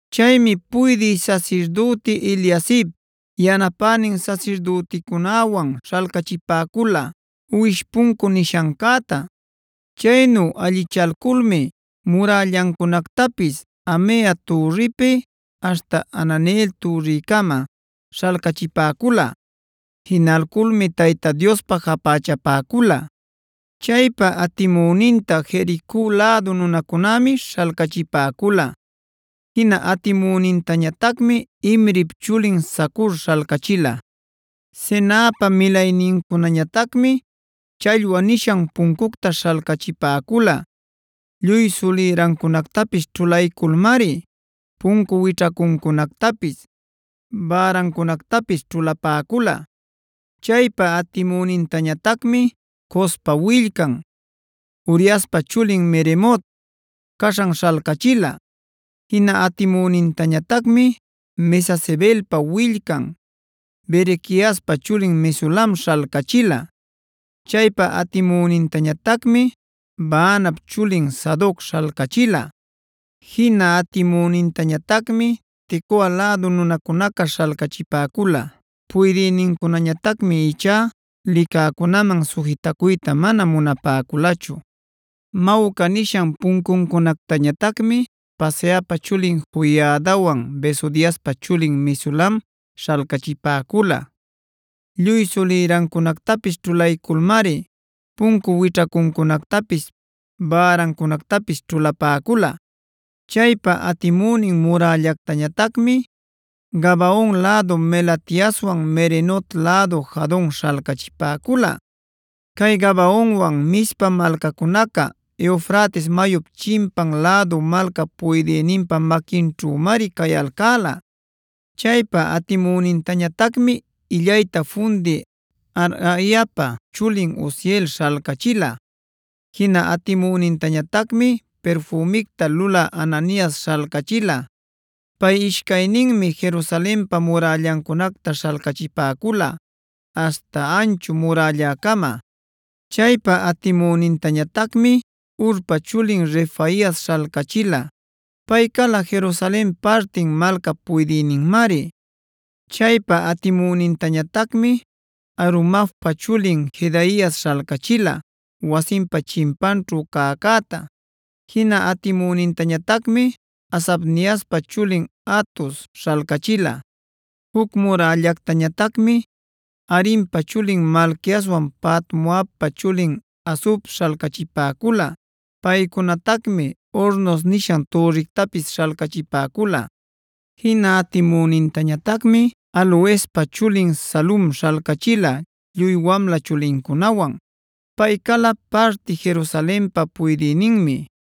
Chaymi puydï sasirdüti Eliasib yanapänin sasirdüticunäwan śhalcachipäcula Uwish Puncu nishancäta. Chaynu allichalculmi murällancunactapis Hamea türripi aśhta Hananeel türricama śhalcachipäcula. Jinalculmi Tayta Diospä japächapäcula. Chaypa atimüninta Jerico lädu nunacunämi śhalcachipäcula. Jina atimünintañatacmi Imrip chulin Zacur śhalcachila. Senaapa milaynincunañatacmi Challwa nishan puncucta śhalcachipäcula. Lluy sulïrancunactapis ćhulayculmari puncu wićhacuncunactapis, bärancunactapis ćhulapäcula. Chaypa atimünintañatacmi Cospa willcan, Uriaspa chulin Meremot caśhan śhalcachila. Jina atimünintañatacmi Mesezabeelpa willcan, Berequiaspa chulin Mesulam śhalcachila. Chaypa atimünintañatacmi Baanap chulin Sadoc śhalcachila. Jina atimünintañatacmi Tecoa lädu nunacunaca śhalcachipäcula. Puydïnincunañatacmi ichá licäcunaman sujitacuyta mana munapäculachu. Mawca nishan puncuncunactañatacmi Paseahpa chulin Joiadawan Besodiaspa chulin Mesulam śhalcachipäcula. Lluy sulïrancunactapis ćhulayculmari puncu wićhacuncunactapis, bärancunactapis ćhulapäcula. Chaypa atimünin murällactañatacmi Gabaon lädu Melatiaswan Meronot lädu Jadon śhalcachipäcula. Cay Gabaonwan Mizpa malcacunaca Eufrates mayup chimpan lädu malcap puydïninpa maquinćhümari cayalcäla. Chaypa atimünintañatacmi illayta fundï Harhaiapa chulin Uziel śhalcachila. Jina atimünintañatacmi pirfümicta lulä Hananias śhalcachila. Pay ishcayninmi Jerusalenpa murällancunacta śhalcachipäcula aśhta Anchu Murällacama. Chaypa atimünintañatacmi Hurpa chulin Refaias śhalcachila. Pay cala Jerusalen partin malcap puydïninmari. Chaypa atimünintañatacmi Harumafpa chulin Jedaias śhalcachila wasinpa chimpanćhu cäcäta. Jina atimünintañatacmi Hasabniaspa chulin Hatus śhalcachila. Juc murällätañatacmi Harimpa chulin Malquiaswan Pahat-moabpa chulin Hasub śhalcachipäcula. Paycunatacmi Hornos nishan türrictapis śhalcachipäcula. Jina atimünintañatacmi Halohespa chulin Salum śhalcachila lluy wamla chulincunawan. Pay cala parti Jerusalenpa puydïninmi.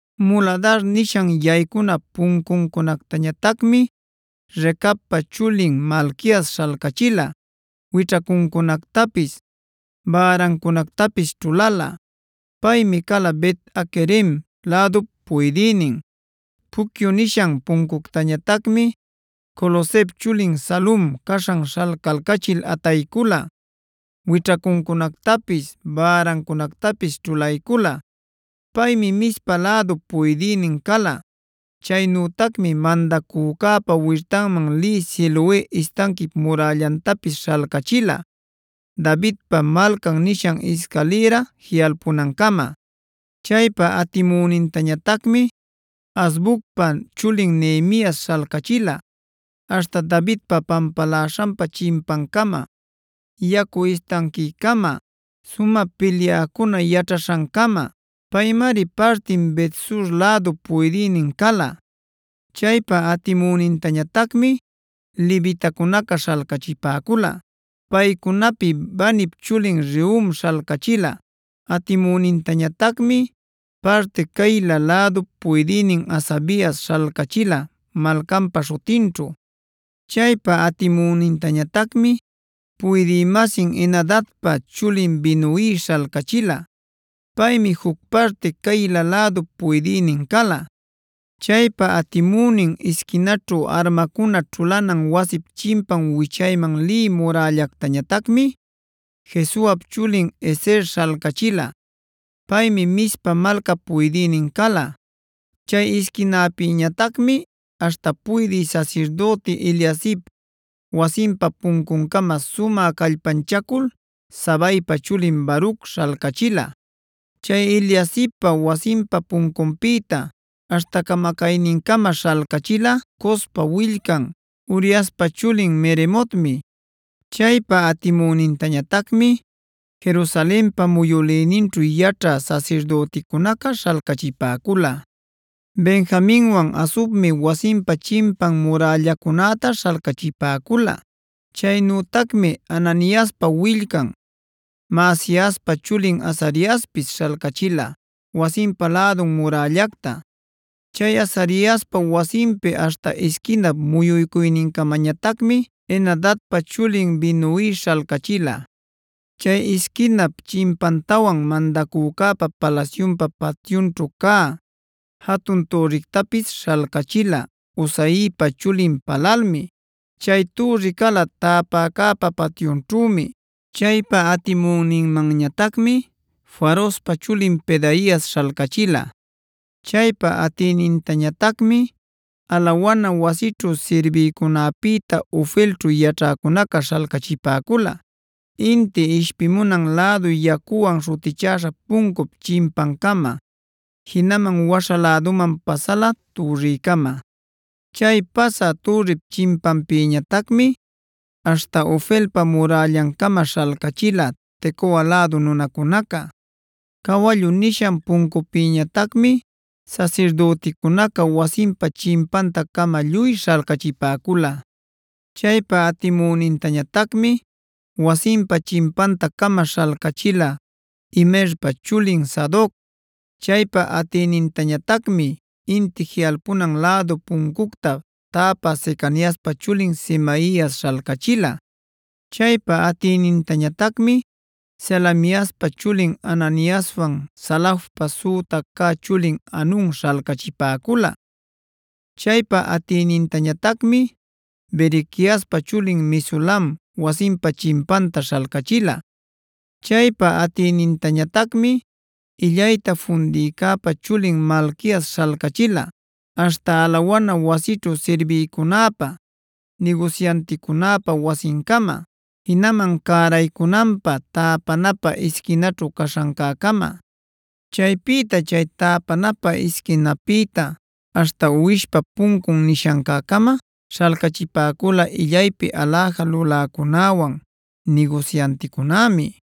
Muladara nishan yaycuna puncuncunactañatacmi Recabpa chulin Malquias śhalcachila; wićhacuncunactapis, bärancunactapis ćhulala. Paymi cala Bet-haquerem lädup puydïnin. Pucyu nishan puncuctañatacmi Colhozep chulin Salum caśhan śhalcalcachil ataycula, wićhacuncunactapis bärancunactapis ćhulaycula. Paymi Mizpa lädup puydïnin cala. Chaynütacmi mandacücäpa wirtanman lï Siloe istanquip murällantapis śhalcachila Davidpa Malcan nishan iscalïra jiꞌalpunancama. Chaypa atimünintañatacmi Azbucpa chulin Nehemias śhalcachila aśhta Davidpa pampaläśhanpa chimpancama, yacu istanquicama, sumä pilyäcuna yaćhaśhancama. Paymari partin Bet-sur lädup puydïnin cala. Chaypa atimünintañatacmi levitacunaca śhalcachipäcula. Paycunapi Banip chulin Rehum śhalcachila. Atimüninmanñatacmi parti Keila lädup puydïnin Hasabias śhalcachila malcanpa śhutinćhu. Chaypa atimünintañatacmi puydï-masin Henadadpa chulin Binnuib śhalcachila. Paymi juc parti Keila lädup puydïnin cala. Chaypa atimünin isquinaćhu armacuna ćhulanan wasip chimpan wichayman lï murällactañatacmi Jesuap chulin Ezer śhalcachila. Paymi Mizpa malcap puydïnin cala. Chay isquinapïñatacmi aśhta puydï sasirdüti Eliasib wasinpa puncuncama sumä callpanchacul Zabaipa chulin Baruc śhalcachila. Chay Eliasibpa wasinpa puncunpïta aśhta camacaynincama śhalcachila Cospa willcan, Uriaspa chulin Meremotmi. Chaypa atimünintañatacmi Jerusalenpa muyülïninćhu yaćhä sasirdüticunaca śhalcachipäcula. Benjaminwan Hasubmi wasinpa chimpan murällacunäta śhalcachipäcula. Chaynütacmi Ananiaspa willcan, Maasiaspa chulin Azariaspis śhalcachila wasinpa lädun murällacta. Chay Azariaspa wasinpi aśhta isquinap muyuycuynincamañatacmi Henadadpa chulin Binui śhalcachila. Chay isquinap chimpantawan mandacücäpa palasyunpa patyunćhu cä jatun türrictapis śhalcachila Uzaipa chulin Palalmi; chay türri cala täpäcäpa patyunćhümi. Chaypa atimüninmanñatacmi Farospa chulin Pedaias śhalcachila. Chaypa atïnintañatacmi alawana wasićhu sirbïcunäpïta Ofelćhu yaćhäcunaca śhalcachipäcula inti ishpimunan lädu Yacuwan śhutichäśha puncup chimpancama, jinaman waśha läduman pasala türricama. Chay pasä türrip chimpanpïtañatacmi aśhta Ofelpa murällancama śhalcachila Tecoa lädu nunacunaca. Cawallu nishan puncupïtañatacmi sasirdüticunaca wasinpa chimpanta-cama lluy śhalcachipäcula. Chaypa atimünintañatacmi wasinpa chimpanta-cama śhalcachila Imerpa chulin Sadoc. Chaypa atïnintañatacmi Inti Jiꞌalpunan Lädu Puncucta täpä Secaniaspa chulin Semaias śhalcachila. Chaypa atïnintañatacmi Selemiaspa chulin Hananiaswan Salafpa süta cä chulin Hanun śhalcachipäcula. Chaypa atïnintañatacmi Berequiaspa chulin Mesulam wasinpa chimpanta śhalcachila. Chaypa atïnintañatacmi illayta fundïcäpa chulin Malquias śhalcachila aśhta alawana wasićhu sirbïcunäpa, nigusyanticunäpa wasincama, jinaman cäraycunanpä täpanapä isquinaćhu caśhancäcama. Chaypïta chay täpanapä isquinäpïta aśhta Uwishpa Puncun nishancäcama śhalcachipäcula illaypi aläja luläcunäwan, nigusyanticunämi.